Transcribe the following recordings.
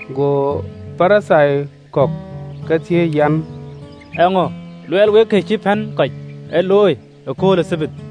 Go Parithai kɔ̈k ke thiëëc an, “Eeŋö luɔɔi wek kë cï pɛ̈n kɔc ë luɔi ëkööl ë Thabath?”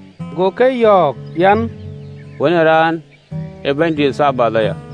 Go ke yɔ̈ɔ̈k an, “Wën ë Raan ee Bɛ̈nydïït ë Thabath aya.”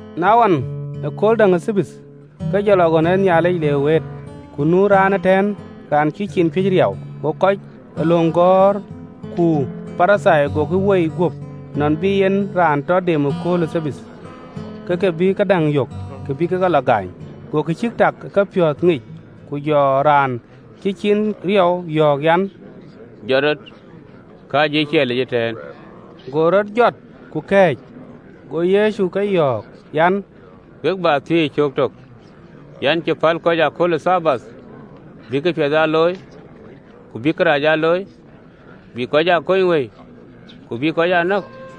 Na wën, ëkööl däŋ ë Thabath, ke jɔ lɔ ɣön ë Nhialic le wëët, ku nu raan ëtɛ̈ɛ̈n raan cï ciin cuëc riɔu. Go kɔc ee löŋ gɔ̈ɔ̈r ku Parithai gokï woi guöp, nɔn bï en raan tɔ dem ëkööl ë Thabath, ke ke bï këdäŋ yök kë bï kek e lɔ gaany. Go kë cïk tak ë kepiɔ̈ɔ̈th ŋic, ku jɔ raan cï ciin riɔu yɔ̈ɔ̈k an, “Jɔt rɔt, kääcë ë ciɛɛlic ëtɛ̈ɛ̈n.” Go rɔt jɔt ku kɛ̈ɛ̈c. Go Yecu ke yɔ̈ɔ̈k an, “We bä thiëc cöök tök an, cï päl kɔc ë akööl ë Thabath bïk këpiɛth aa looi, ku bïk kërac aa looi? Bïk kɔc aa kony wëi, ku bïk kɔc aa nɔ̈k?”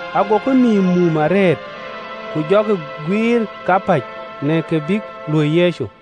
Agokï nïïm mum arëët, ku jɔkï guiir kapäc, në kë bïk luöi Yecu.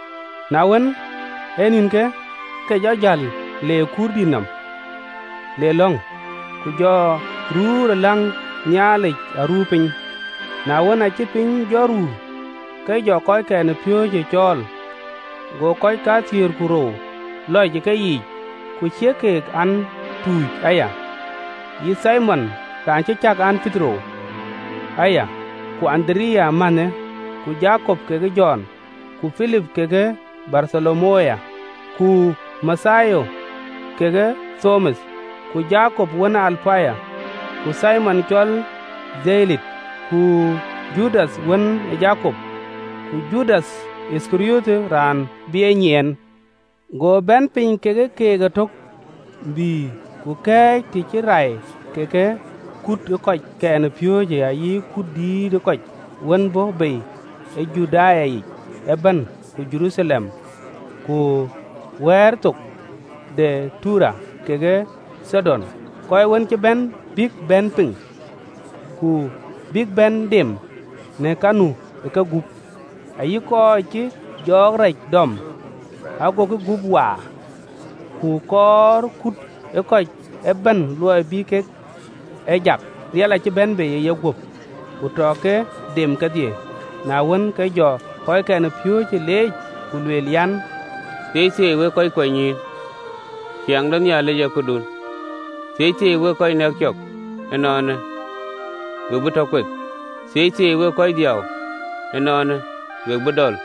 Na wën, ee nïnkë, ke jɔ jäl le ë kuurdït nɔm le lɔ̈ŋ, ku jɔ ruu ë lɔ̈ŋ Nhialic aruuwë piny. Na wën, aacï piny jɔ ruu, ke jɔ kɔckɛn ë piööcë cɔɔl, go kɔc kathiëër ku rou lɔc ë keyiic, ku ciëk keek an, tuuc aya, yï Thimon, raan cï cäk an, Petero aya, ku Andereya mänhë, ku Jakop kekë Jɔn, ku Pilip kekë Bartholomayo, Ku Mathayo kekë Thoma, ku Jakop wën ë Alapayo, ku Thimon cɔl Dhelote. Ku Judath wën ë Jakop, ku Judath Yithkariɔt, raan bï e nyiɛɛn. Go bɛ̈n piny kekë keek ëtök, bï ku kɛ̈ɛ̈c të cï rai kekë kut ë kɔckɛn ë piööcë ayï kut dït ë kɔc wën bɔ̈ bei ë Juda yic ëbɛ̈n ku Jeruthalem, ku wɛ̈ɛ̈r de Tayer thok kekë Thidon, kɔc wën cï bɛ̈n bïk bɛ̈n piŋ, ku bïk bɛ̈n dem në ka nu ë kegup, ayï kɔc cïï jɔɔk rac dɔm, agokï gup waar. Ku kɔɔr kut ë kɔc ëbɛ̈n luɔi bï kek e jak, riɛl aaye bɛ̈n bei ë yeguöp, ku tɔ ke dem kedhie. Na wën, ke jɔ kɔckɛn ë piööcë leec, ku lueel an, “Thieithieei wek kɔc kuanynyïïn, ciɛɛŋ de Nhialic ee këdun! “Thieithieei wek kɔc nɛ̈k cɔk ënɔɔnë, we bï tɔ kueth! “Thieithieei wek kɔc dhiau ënɔɔnë, we bï dɔl!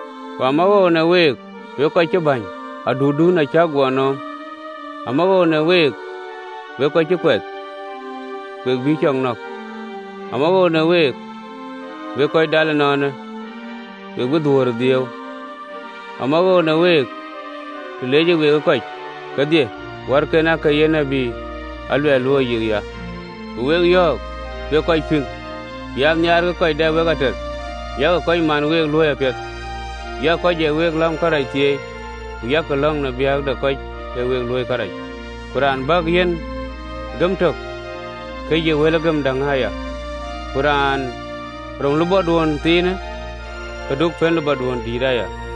“Ku amawoou në week wek kɔc cï bäny, adutdun acäk guɔ nööm! “Amawoou në week wek kɔc cï kuɛth, we bïï cɔk nɔ̈k! “Amawoou në week, wek kɔc dɔl ënɔɔnë, we bï dhuöör ë dhiëëu! “Amawoou në week, të leecë week ë kɔc kedhie, wärken aake ye tït aluɛth luööi yikya. “Ku wek yɔ̈ɔ̈k, wek kɔc pïŋ an: Nhiaarkï kɔc dɛ wek ater, yak kɔc man week luööi apiɛth, yak kɔc ë wek läm kërac thieei, ku yak lɔ̈ŋ në biäk de kɔc ee week luöi kërac. Ku raan biäk yïn gëm tök, ke yï wel gëm däŋ aya, ku raan rum lupɔduön thiinë, ke du pën alulutdu aya.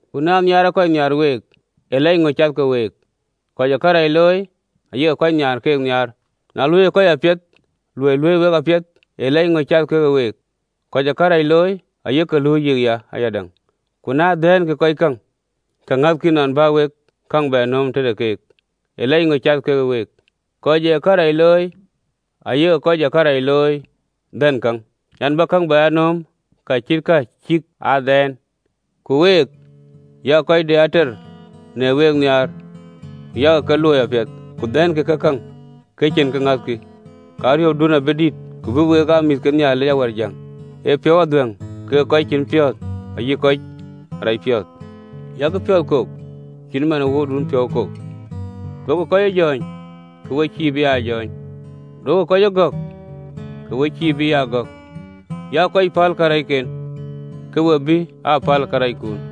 “Ku na nhiaarkï kɔc nhiaar week, ee lɛc ŋö cath ke week? Kɔc ee kërac looi ayek kɔc nhiaar keek nhiaar! Ku na luööikï kɔc apiɛth kɔc luui week apiɛth ee lɛc ŋö cath ke week? Kɔc ee kërac looi ayek luui yikya ayadäŋ. Ku na dhɛ̈nkï kɔc käŋ kɔc ŋäthkï nɔn bä wek käŋ bɛ nööm tëde keek, ee lɛc ŋö cath ke week? Kɔc ee kërac looi ayek kɔc ee kërac looi dhɛ̈n käŋ an, bïk käŋ bɛ aa nööm ka cïk aa dhɛɛn! Ku week, yak kɔc de ater në week nhiaar, ku yak ke luööi apiɛth, ku dhɛ̈nkï ke käŋ, ku cïn kë ŋäthkï, ke ariöpdun abï dït, ku we bï aa mïth ke Nhialic Awärjäŋ, ee piɔ̈u adhuɛ̈ŋ kekë kɔc cïn piɔ̈ɔ̈th ayï kɔc racpiɔ̈ɔ̈th. Yak piɔ̈ɔ̈th kok cït man ee Wuöördun piɔ̈u kok. “Duökï kɔc ee jɔ̈ɔ̈ny, ke we cïï bï aa jɔ̈ɔ̈ny: duökï kɔc ee gɔ̈k, ke we cïï bï aa gɔ̈k: yak kɔc päl karɛcken, ke we bï päl karɛckun.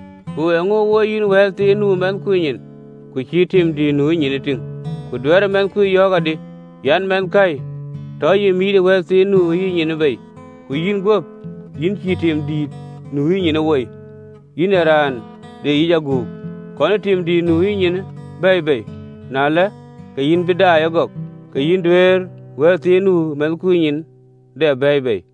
“Ku eeŋö woi yïn wɛ̈ɛ̈l thiin nu ë mɛnhkui nyin, ku cïï tim dïït nu ë yïnyin ee tïŋ? Ku duɛ̈ɛ̈rë mɛnhkui yɔ̈ɔ̈k adï an, ‘Mɛnhkäi, tɔ ya mïït ee wɛ̈ɛ̈l thiin nu ë yïnyin bei, ku yïn guöp yïn cïï timdïït nu ë yïnyinë woi? Yïn ee raan de yic aguk, kɔnë tim dïït nu ë yïnyinë bɛ̈ɛ̈i bei, na ëlë, ke yïn bï daai ëgɔk, ke yïn duëër wɛ̈ɛ̈l thiin nu ë mɛnhkui nyin dap bɛ̈ɛ̈i bei.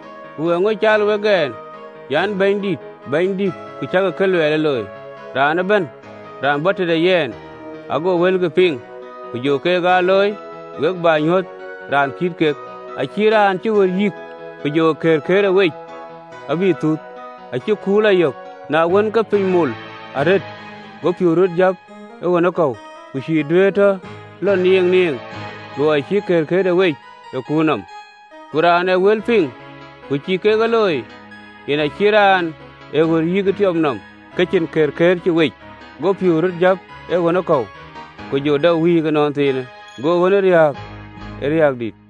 Ku eeŋö caal wek ɛn an, “Bɛ̈nydït, Bɛ̈nydït, ku cäkï ka luɛɛl ee looi? Raan ëbɛ̈n raan bɔ̈ tëde yɛn, ago wëlkï piŋ, ku jɔ keek aa looi, we bä nyuöth raan kït kek, acït raan cï ɣöt yïk, ku jɔ këërkëër wec abï thuth, acï kuur lɔ yök: na wën, ke piny mol arëët, go piëëu röt jäp ë ɣönë kɔ̈u, ku cïï duëër tɔ lɔ nieeŋnieeŋ: luɔi cï këërkëërde wec ë kuur nɔm. Ku raan ë wël piŋ, ku cïï keek ee looi, yen acït raan ë ɣöt yïk ë tiɔp nɔm ke cïn këërkëër cï wec, go piëëu röt jäp ee ɣönë kɔ̈u, ku jɔ dap wïïk ënɔnthiinë, go ɣönë riääk ë riääk dït!”